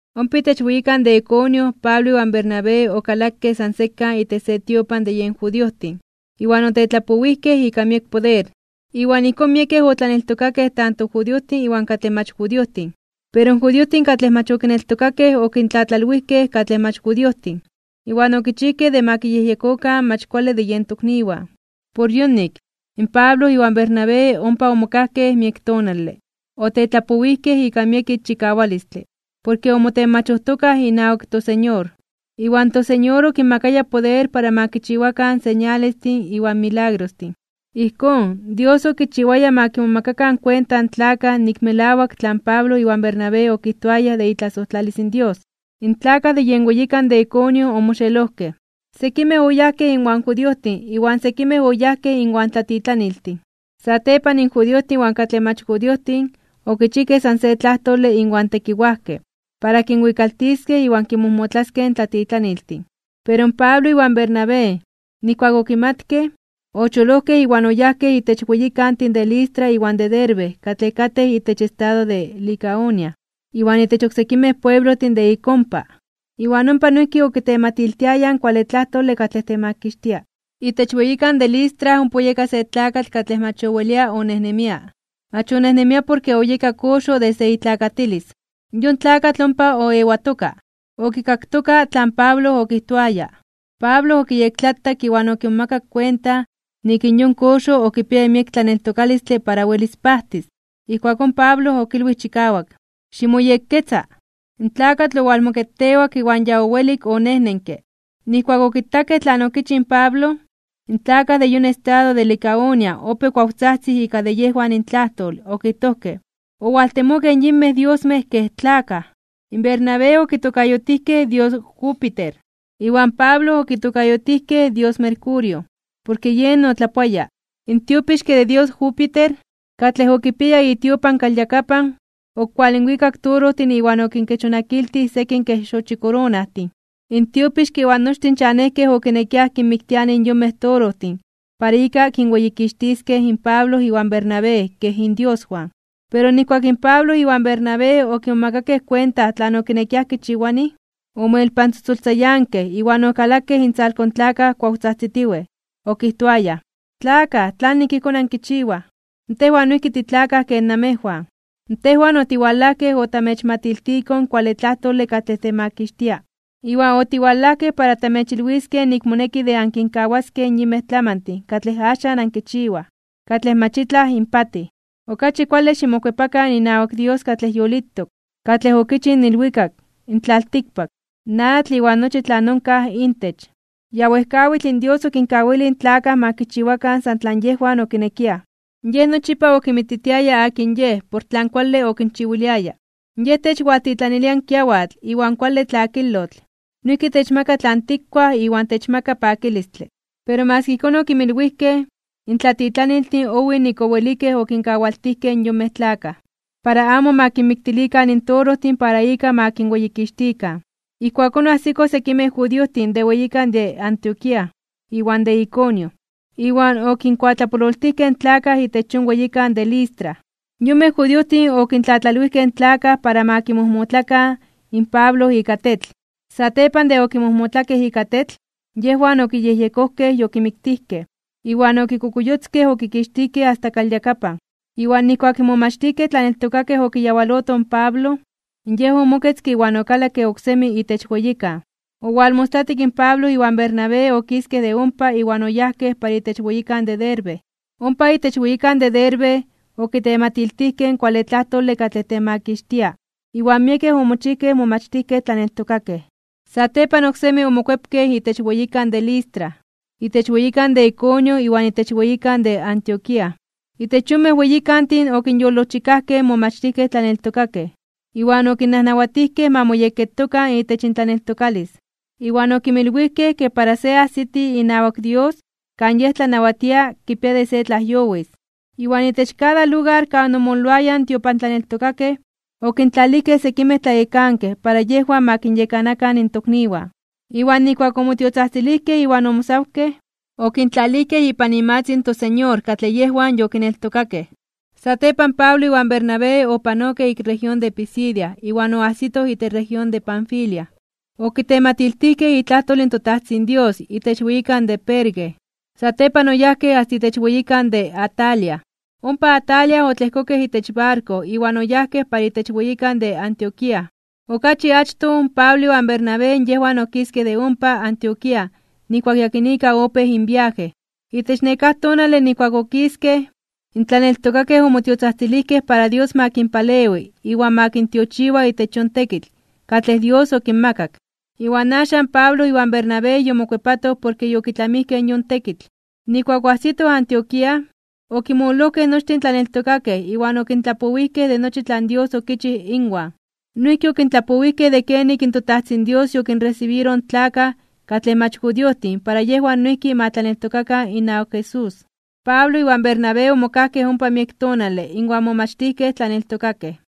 Ompa itech weyikan de Iconio Pablo iwan Bernabé okalakej san sekan itech se tiopan de yen judiojtin, iwan otetlapowijkej ika miek poder. Iwan ijkón miekej otlaneltokakej tanto judiojtin iwan katlej mach judiojtin. Pero in judiojtin katlej mach okineltokakej, okintlatlalwijkej katlej mach judiojtin, iwan okichijkej de ma kiyejyekokan mach kuale de yen tokniwan. Por yonik, in Pablo iwan Bernabé ompa omokajkej miek tonale. Otetlapowijkej ika miek ixchikawalistle, porke omotenmachojtokaj inawak toSeñor. Iwan toSeñor okinmakaya poder para ma kinchiwakan señalestin iwan milagrostin. Ijkón, Dios okichiwaya ma kimomakakan kuenta in tlakaj nik melawak tlan Pablo iwan Bernabé okijtoayaj de itlasojtlalis in Dios. In tlakaj de yen weyikan de Iconio omoxelojkej, sekimej oyajkej inwan judiojtin iwan sekimej oyajkej inwan tlatitlaniltin. Satepan in judiojtin iwan katlej mach judiojtin, okichijkej san se tlajtole inwan tekiwajkej, para kinwikaltiskej iwan kinmojmotlaskej in tlatitlaniltin. Pero in Pablo iwan Bernabé, nijkuak okimatkej, ocholojkej iwan oyajkej itech weyikantin de Listra iwan de Derbe katlej katej itech estado de Licaonia, iwan itech oksekimej pueblojtin de ik ompa. Iwan ompa noijki okitematiltiayaj in kuale tlajtole katlej temakixtia. Itech weyikan de Listra ompa oyeka se tlakatl katlej mach owelia onejnemia. Mach onejnemia porke oyeka koxo desde itlakatilis. Yon tlakatl ompa oewatoka, okikaktoka tlan Pablo okijtoaya. Pablo okiyektlatak iwan okimomakak kuenta nik in yon koxo okipiaya miek tlaneltokalistle para welis pajtis. Ijkuakón Pablo okilwij chikawak: ―¡Ximoyekketza! In tlakatl owalmoketewak iwan ya owelik onejnenke. Nijkuak okitakej tlan okichij in Pablo, in tlakaj de yon estado de Licaonia opéj kuawtzajtzij ika de yejwan intlajtol, okijtojkej: ―¡Owaltemokej yinmej diosmej kej tlakaj! Bernabé okitokayotijkej dios Júpiter, iwan Pablo okitokayotijkej dios Mercurio, porke yen otlapoaya. In tiopixke de dios Júpiter, katlej okipiaya itiopan kalyakapan, okualinwikak torojtin iwan okinkechonakiltij sekin kej xochikoronajtin. In tiopixke iwan nochtin chanejkej okinekiaj kinmiktilianij yonmej torojtin para ika kinweyikixtiskej in Pablo iwan Bernabé kej indioswan. Pero nijkuak in Pablo iwan Bernabé okimomakakej kuenta tlan okinekiaj kichiwanij, omoelpantzotzoltzayankej iwan okalakej intzalko in tlakaj, kuawtzajtzitiwej. Okijtoayaj: ―¡Tlakaj! ¿Tlanik ijkón ankichiwaj? Tejwan noijki titlakaj ken namejwan. Tejwan otiwalajkej otamechmatiltikoj in kuale tlajtole katlej temakixtia. Iwan otiwalajkej para tamechilwiskej nik moneki de ankinkawaskej in yinmej tlamantin katlej axan ankichiwaj, katlej mach itlaj inpatij. Okachi kuale ximokuepakan inawak Dios katlej yolitok, katlej okichij in ilwikak, in tlaltikpak, in atl iwan nochi tlan onkaj intech. Ya wejkawitl in Dios okinkawilij in tlakaj ma kichiwakan san tlan yejwan okinekiaj. Yej nochipa okinmititiaya akin Yej por tlan kuale okinchiwiliaya. Yej techwaltitlanilia in kiawatl iwan kuale tlakilotl, noijki techmaka tlan tikkuaj iwan techmaka pakilistle. Pero maski ijkón okinmilwijkej, in tlatitlaniltin owij nik owelikej okinkawaltijkej in yonmej tlakaj, para amo ma kinmiktilikan in torojtin para ika ma kinweyikixtikan. Ijkuakón oajsikoj sekimej judiojtin de weyikan de Antioquía iwan de Iconio, iwan okinkuatlapololtijkej in tlakaj itech yon weyikan de Listra. Yonmej judiojtin okintlatlalwijkej in tlakaj para ma kimojmotlakan in Pablo ika tetl. Satepan de okimojmotlakej ika tetl, yejwan okiyejyekojkej yokimiktijkej, iwan okikokuyotzkej okikixtijkej asta kalyakapan. Iwan nijkuak in momachtijkej tlaneltokakej okiyawalotoj in Pablo, yej omoketzke iwan okalakke oksemi itech weyikan. Owalmostlatik in Pablo iwan Bernabé okiskej de ompa iwan oyajkej para itech weyikan de Derbe. Ompa itech weyikan de Derbe okitematiltijkej in kuale tlajtole katlej temakixtia iwan miekej omochijkej momachtijkej tlaneltokakej. Satepan oksemi omokuepkej itech weyikan de Listra, itech weyikan de Iconio iwan itech weyikan de Antioquía. Itech yonmej weyikantin okinyolojchikajkej in momachtijkej tlaneltokakej, iwan okinnajnawatijkej ma moyekketokan itech intlaneltokalis, iwan okinmilwijkej ke para se ajsiti inawak Dios kan Yej tlanawatia kipia de se tlajyowis. Iwan itech kada lugar kan omololoayaj in tiopantlaneltokakej okintlalijkej sekimej tlayekankej para yejwan ma kinyekanakan in tokniwan. Iwan nijkuak omotiotzajtzilijkej iwan omosawkej (oayunarojkej), okintlalijkej ipan imatzin in toSeñor katlej yejwan yokineltokakej. Satepan Pablo iwan Bernabé opanokej ik región de Pisidia iwan oajsitoj itech región de Panfilia. Okitematiltijkej itlajtol in toTajtzin Dios itech weyikan de Perge. Satepan oyajkej asta itech weyikan de Atalia. Ompa Atalia otlejkokej itech barko iwan oyajkej para itech weyikan de Antioquía. Okachi achtoj Pablo iwan Bernabé yejwan okiskej de ompa Antioquía nijkuak yakinika opéj inviaje. Itech nekáj tonale nijkuak okiskej, in tlaneltokakej omotiotzajtzilijkej para Dios ma kinpalewi iwan ma kintiochiwa itech yon tekitl katlej Dios okinmakak. Iwan axan Pablo iwan Bernabé yomokuepatoj porke yokitlamijkej yon tekitl. Nijkuak oajsitoj Antioquía, okinmololojkej nochtin in tlaneltokakej iwan okintlapowijkej de nochi tlan Dios okichij inwan. Noijki okintlapowijkej de kenik in toTajtzin Dios yokinresibiroj in tlakaj katlej mach judiojtin para yejwan noijki ma tlaneltokakan inawak Jesús. Pablo iwan Bernabé omokajkej ompa miek tonale inwan momachtijkej tlaneltokakej.